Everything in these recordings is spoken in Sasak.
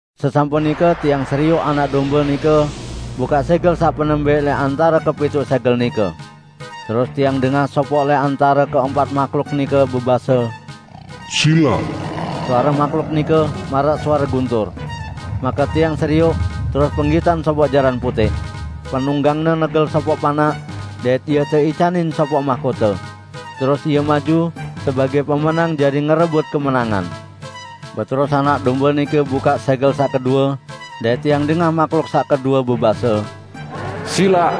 Sesampun nike tiang serioq Anak Dombe nike bukaq sẽgel saq penembẽq lẽq antare kepituq sẽgel nike. Terus tiang dengah sopoq lẽq antare keempat mahluk nike bebase, "Silaq!" Suare mahluk nike maraq suare guntur. Make tiang serioq, terus penggitan sopoq jaran putẽq. Penunggangne negel sopoq panaq, dait ie teicanin sopoq mahkote. Terus ie maju sebagẽ pemenang jari ngerebut kemenangan. Beterus Anak Dombe nike bukaq sẽgel saq kedue, dait tiang dengah mahluk saq kedue bebase, "Silaq!"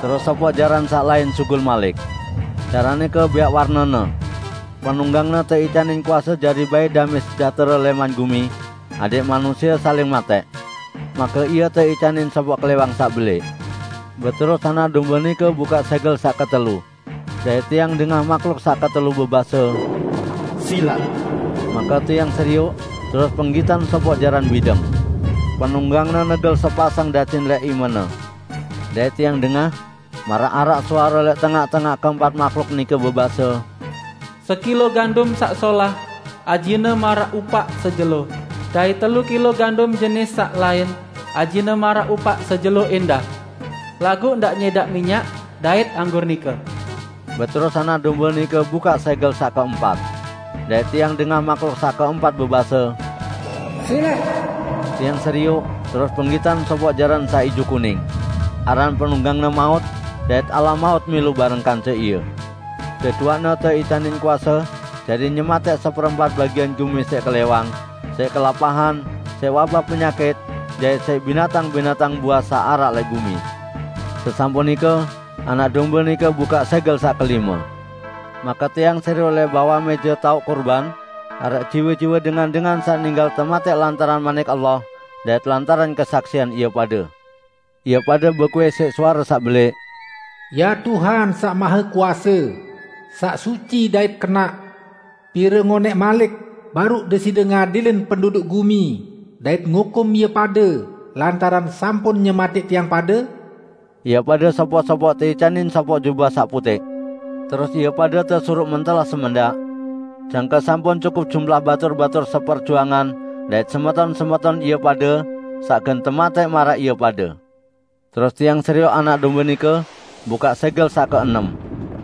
Terus sopoq jaran saq lain sugul malik. Jaran nike bẽaq warnene. Penunggangne teicanin kuase jari bait damẽ sejahtere lẽman gumi, adẽq manusie saling matẽq. Make ie teicanin sopoq klẽwang saq belẽq. Beterus Anak Dombe nike bukaq sẽgel saq ketelu. Dait tiang dengah mahluk saq ketelu bebase, "Silaq!" Make tiang serioq, terus penggitan sopoq jaran bideng. Penunggangne negel sepasang dacin lẽq imene. Dait tiang dengah maraq araq suare lẽq tengaq-tengaq keempat mahluk nike bebase, "Sekilo gandum saq solah, ajine maraq upaq sejelo, dait telu kilo gandum jenis saq lain ajine maraq upaq sejelo ẽndah. Laguq ndaq nyẽdaq minyak dait anggur nike!" Beterus Anak Dombe nike bukaq sẽgel saq keempat. Dait tiang dengah mahluk saq keempat bebase, "Silaq!" Tiang serioq, terus penggitan sopoq jaran saq ijo kuning. Aran penunggangne Maut dait alam maut milu bareng kance ie. Deduaqne teicanin kuase jari nyematẽq seperempat bagian gumi siq klẽwang, siq kelapahan, siq wabah penyakit dait siq binatang-binatang buas saq araq lẽq gumi. Sesampun nike Anak Dombe nike bukaq sẽgel saq kelime. Make tiang serioq lẽq bawaq mẽje taoq kurban, araq jiwe-jiwe dengan-dengan saq ninggal tematẽq lantaran Manik Allah dait lantaran kesaksian ie pade. Ie pade bekuih siq suare saq belẽq, "Ya Tuhan Saq Mahekuase, saq suci dait kenaq! Pire ngonẽq malik baruq Deside ngadilin penduduk gumi dait ngukum ie pade lantaran sampun nyematẽq tiang pade?" Ie pade sopoq-sopoq teicanin sopoq jubah saq putẽq. Terus ie pade tesuruq mentelah semendaq, jangke sampun cukup jumlah batur-batur seperjuangan dait semeton-semeton ie pade saq gen tematẽq maraq ie pade. Terus tiang serioq Anak Dombe nike bukaq sẽgel saq keenem.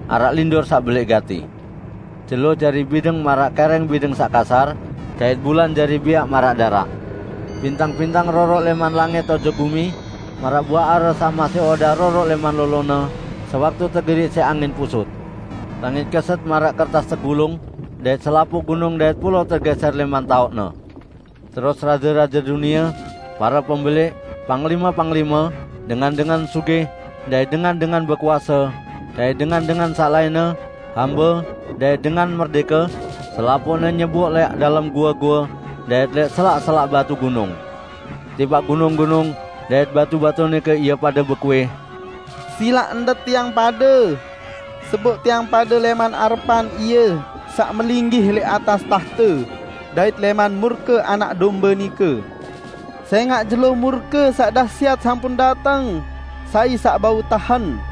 Araq lindur saq belẽq gati. Jelo jari bideng maraq kẽrẽng bideng saq kasar, dait bulan jari bẽaq maraq daraq. Bintang-bintang roroq lẽman langit ojok gumi maraq buaq are saq masih odaq roroq lẽman lolone sewaktu tegerik siq angin pusut. Langit keset maraq kertas tegulung, dait selapuq gunung dait pulao tegẽsẽr lẽman taoqne. Terus raje-raje dunie, pare pembelẽq, panglime-panglime, dengan-dengan sugih dait dengan-dengan bekuase, dait dengan-dengan saq lainne, hambe dait dengan merdẽke, selapuqne nyeboq lẽq dalem goe-goe dait lẽq selak-selak batu gunung. Tipaq gunung-gunung dait batu-batu nike ie pade bekuih, "Silaq endet tiang pade! Seboq tiang pade lẽman arepan Ie saq melinggih lẽq atas tahte, dait lẽman murke Anak Dombe nike! Sẽngaq jelo murke saq dahsyat sampun dateng, sai saq bau tahen?"